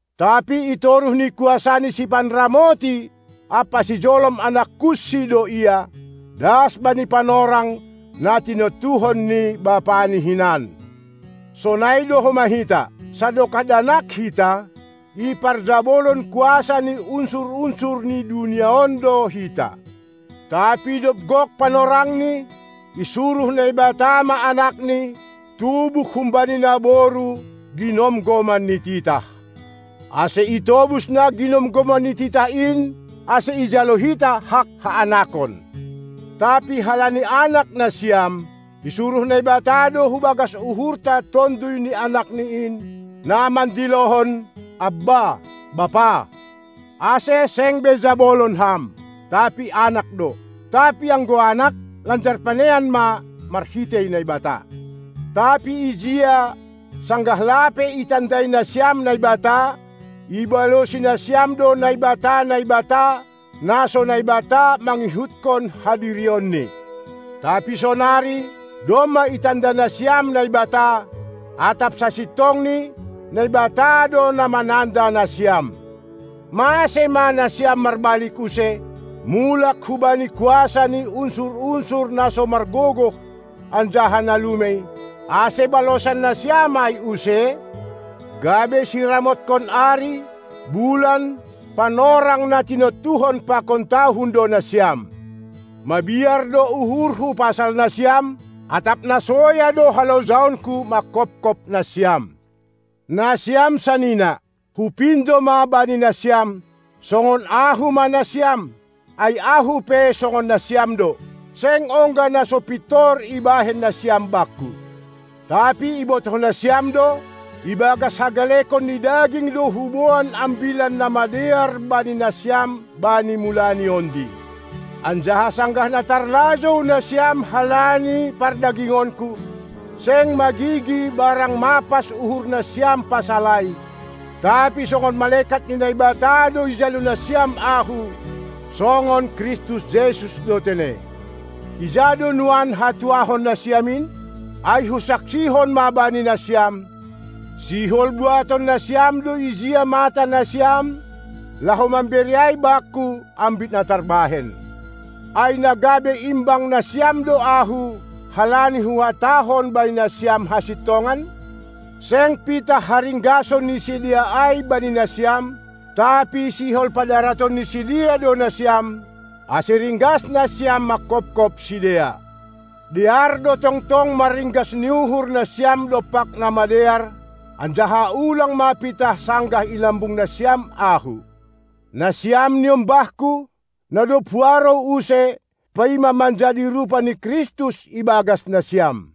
tapi itoruh ni kuasa ni sipanramoti ampa sijolom anak kunsi do ia, das bani panorang, na tinontuhon ni bapani hinan. Sonai do homa hita: Sadokah danak hita, iparjabolon kuasa ni unsur-unsur ni dunia on do hita. Tapi dob gok panorangni, isuruh Naibata ma Anakni, tubuh humbani naboru, ginomgoman ni titah, ase itobus na ginomgoman ni titah in, ase ijalo hita hak haanakon. Tapi halani anak nasiam, isuruh Naibata do hubagas uhurta Tonduy ni Anakni in, na mandilohon: Abba, Bapa! Ase, seng be jabolon ham, tapi anak do. Tapi anggo anak, lanjar panean ma, marhitei Naibata. Tapi ijia, sanggah lape itandai nasiam Naibata, ibalosi nasiam do naibata-naibata, na so Naibata mangihutkon hadirionni. Tapi sonari, domma itanda nasiam Naibata, atap sasintongni, Naibata do na mananda nasiam. Mase ma nasiam marbalik use, mulak hubani kuasa ni unsur-unsur na so margogoh anjaha na lumei, ase balosan nasiam ai use? Gabe siramotkon ari, bulan, panorang na tinontuhon pakon tahun do nasiam. Mabiar do uhurhu pasal nasiam, atap na soya do halojaonku manghopkop nasiam. Nasiam sanina, hupindo ma bani nasiam, songon ahu ma nasiam, ai ahu pe songon nasiam do. Seng ongga na so pintor ibahen nasiam bakku. Tapi ibotoh nasiam do, ibagas hagalekon ni daging do huboan Ambilan Namadear bani nasiam bani mulani ondi. Anjaha sanggah na tarlajou nasiam halani pardagingonku, seng magigi barang mapas uhur nasiam pasal ai, tapi songon malekat ni Naibata do ijalo nasiam ahu, songon Kristus Jesus do tene. Ija do nuan hatuahon nasiam in? Ai husaksihon ma bani nasiam, sihol buaton nasiam do ijia mata nasiam, laho mambere ai bakku, ambit na tarbahen. Ai na gabe imbang nasiam do ahu, halani huhatahon bani nasiam hasintongan? Seng pitah haringgason ni sidea ai bani nasiam, tapi sihol padaraton ni sidea do nasiam, ase ringgas nasiam manghophop sidea. Dear do tongtong marringgas ni uhur nasiam dompak na madear, anjaha ulang ma pitah sanggah i lambung nasiam ahu. Nasiam niombahku, na dob huarou use, paima manjadi rupa ni Kristus ibagas nasiam.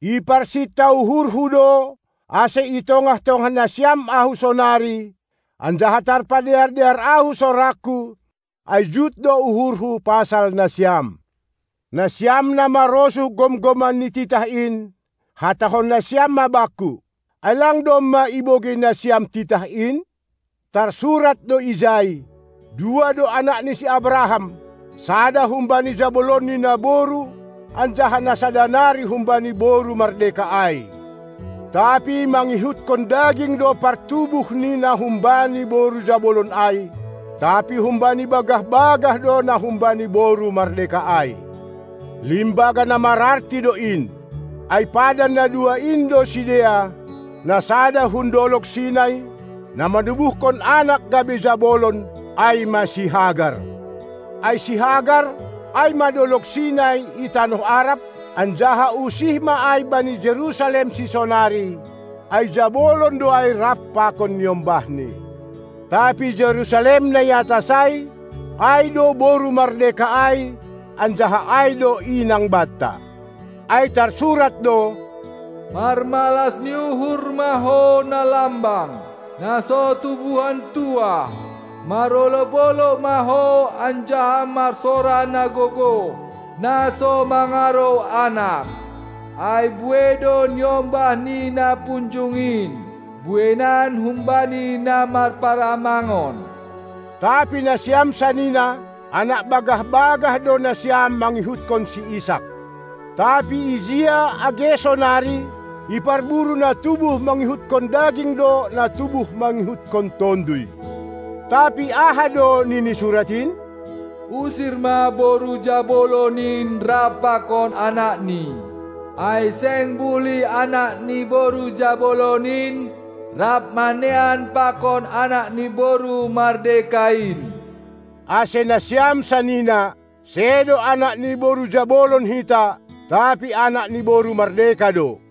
Iparsinta uhurhu do, ase itongah-tongah nasiam ahu sonari, anjaha tarpadear-dear ahu sorangku, ai jut do uhurhu pasal nasiam. Nasiam na marosuh gomgoman ni titah in, hatahon nasiam ma bakku: Ai lang domma ibogei nasiam titah in? Tarsurat do ijai: Dua do anak ni si Abraham, sada humbani jabolonni naboru anjaha na sada nari humbani boru mardeka ai. Tapi mangihutkon daging do partubuh ni na humbani boru jabolon ai, tapi humbani bagah-bagah do na humbani boru mardeka ai. Limbaga na mararti do in. Ai padan na dua in do sidea: Na sada hun dolog Sinai, na manubuhkon anak gabe jabolon, ai ma si Hagar. Ai Hagar ai ma dolog Sinai i tanoh Arab, anjaha usih ma ai bani Jerusalem sisonari, ai jabolon do ai rap pakon niombahni. Tapi Jerusalem na iatas ai, ai do boru mardeka ai, anjaha ai do inang banta. Ai tarsurat do: Marmalas ni uhur ma ho na lambang, na so tubuhan tuah; marolob-olob ma ho anjaha marsora na gogoh, na so mangarou anak. Ai buei do niombah ni na punjung in, bueinan humbani na marparamangon. Tapi nasiam sanina, anak bagah-bagah do nasiam mangihuthon si Isak. Tapi ijia age sonari, iparburu na tubuh mangihutkon daging do na tubuh mangihutkon Tonduy. Tapi aha do nini Surat in? Usir ma boru jabolon in rap pakon anakni, ai seng bulih anak ni boru jabolon in rap manean pakon anak ni boru mardeka in. Ase, nasiam sanina, sedo anak ni boru jabolon hita, tapi anak ni boru mardeka do.